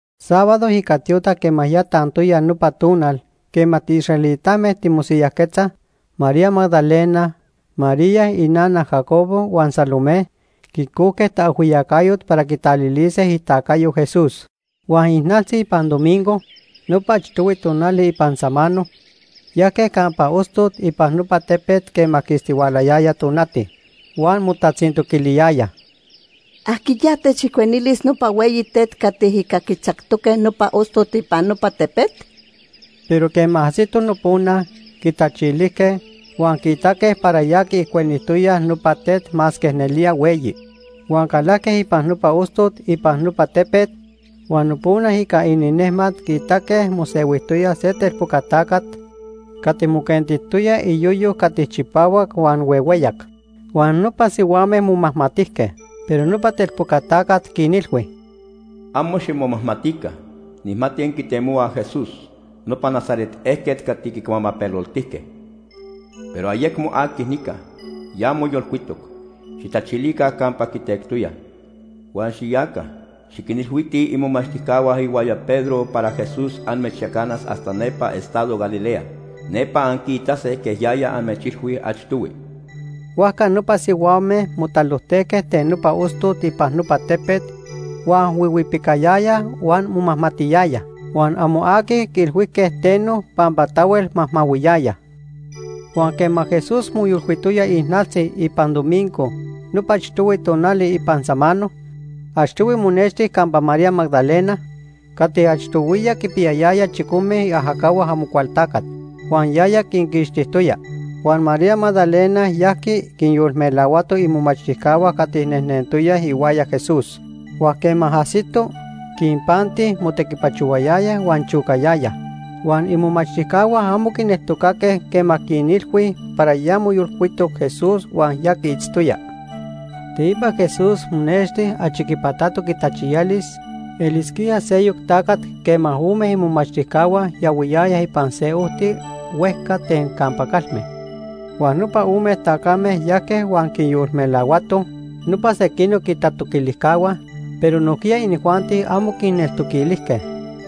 Sábado ica tiotac quema ya tantoya nopa tonal quema tiisraelitame timosiyajquetzaj, María Magdalena, María inana Jacobo, huan Salomé quicojque taajhuiyacayot para quitalilise itacayo Jesús. Huan ijnaltzi ipan domingo, nopa achtohui tonali ipan samano, yajque campa ostot ipan nopa tepet quema quistihualayaya tonati. Huan motatzintoquiliyayaj: ―¿Ajquiya techijcuenilis nopa hueyi tet cati ica quitzactoque nopa ostot ipan nopa tepet? Pero quema ajsitoj nopona, quitachilijque, huan quiitaque para ya quiijcuenijtoyaj nopa tet masque nelía hueyi. Huan calajque ipan nopa ostot ipan nopa tepet, huan nopona ica ininejmat quiitaque mosehuijtoya se telpoca tacat cati moquentijtoya iyoyo cati chipahuac huan huehueyac. Huan nopa sihuame momajmatijque. Pero nopa telpoca tacat quinilhui: ―Amo ximomajmatica. Nijmati anquitemohuaj Jesús, nopa Nazaret ejquet cati quicuamapeloltijque. Pero ayecmo aqui nica, ya moyolcuitoc. Xijtachilica campa quitectoyaj. Huan xiyaca, xiquinilhuitij imomachtijcahua ihuaya Pedro para Jesús amechyacanas hasta nepa estado Galilea. Nepa anquiitase quej yaya amechilhui achtohui. Huajca nopa sihuame motalojtejque ten nopa ostot ipan nopa tepet huan huihuipicayayaj huan momajmatiyayaj. Huan amo aqui quiilhuijque teno pampa tahuel majmahuiyayaj. Huan quema Jesús moyolcuitoya ijnaltzi ipan domingo nopa achtohui tonali ipan samano, achtohui monexti campa María Magdalena cati achtohuiya quinpiyayaya chicome iajacahua Amocualtacat huan yaya quinquixtijtoya. Huan María Magdalena yajqui quinyolmelahuato imomachtijcahua cati nejnentoyaj ihuaya Jesús. Huan quema ajsito, quinpanti motequipachohuayayaj huan chocayayaj. Huan imomachtijcahua amo quineltocaque quema quinilhui para ya moyolcuitoc Jesús huan ya quiitztoya. Teipa Jesús monexti achi quipatatoc itachiyalis elisquía seyoc tacat quema ome imomachtijcahua yahuiyayaj ipan se ojti huejca ten campa calme. Huan nopa ome tacame yajque huan quinyolmelahuatoj nopa sequinoc itatoquilijcahua, pero nojquiya inijuanti amo quinneltoquilijque.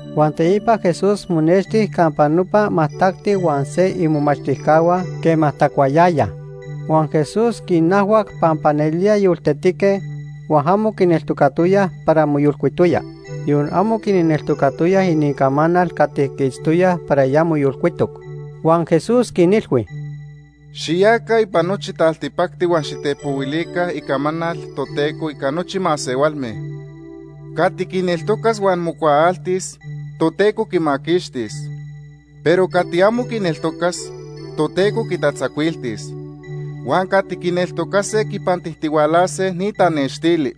Huan teipa Jesús monexti campa nopa majtacti huan se imomachtijcahua quema tacuayayaj. Huan Jesús quinajhuac pampa nelía yoltetique, huan amo quineltocatoyaj para moyolcuitoya. Yon amo quinneltocatoyaj inincamanal cati quiitztoyaj para ya moyolcuitoc. Huan Jesús quinilhui: “Xiyaca ipan nochi taltipacti huan xitepohuilica icamanal Toteco ica nochi masehualme. Cati quineltocas huan mocuaaltis, Toteco quimaquixtis. Pero cati amo quineltocas, Toteco quitatzacuiltis. Huan cati quineltocase quipantijtihualase ni tanextili.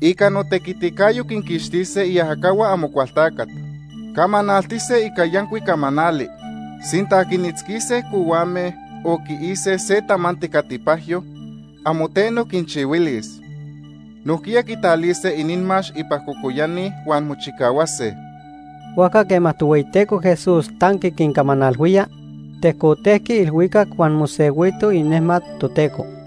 Ica notequiticayo quinquixtise iajacahua Amocualtacat. Camanaltise ica yancuic camanali. Sinta quinitzquise cohuame o quiise se tamanti cati pajyo, amo teno quinchihuilis. Nojquiya quitalise inimax ipan cocoyani huan mochicahuase.” Huajca quema Tohueyiteco Jesús tanqui quincamanalhuía, tejcotejqui ilhuicac huan mosehuito inejmat Toteco.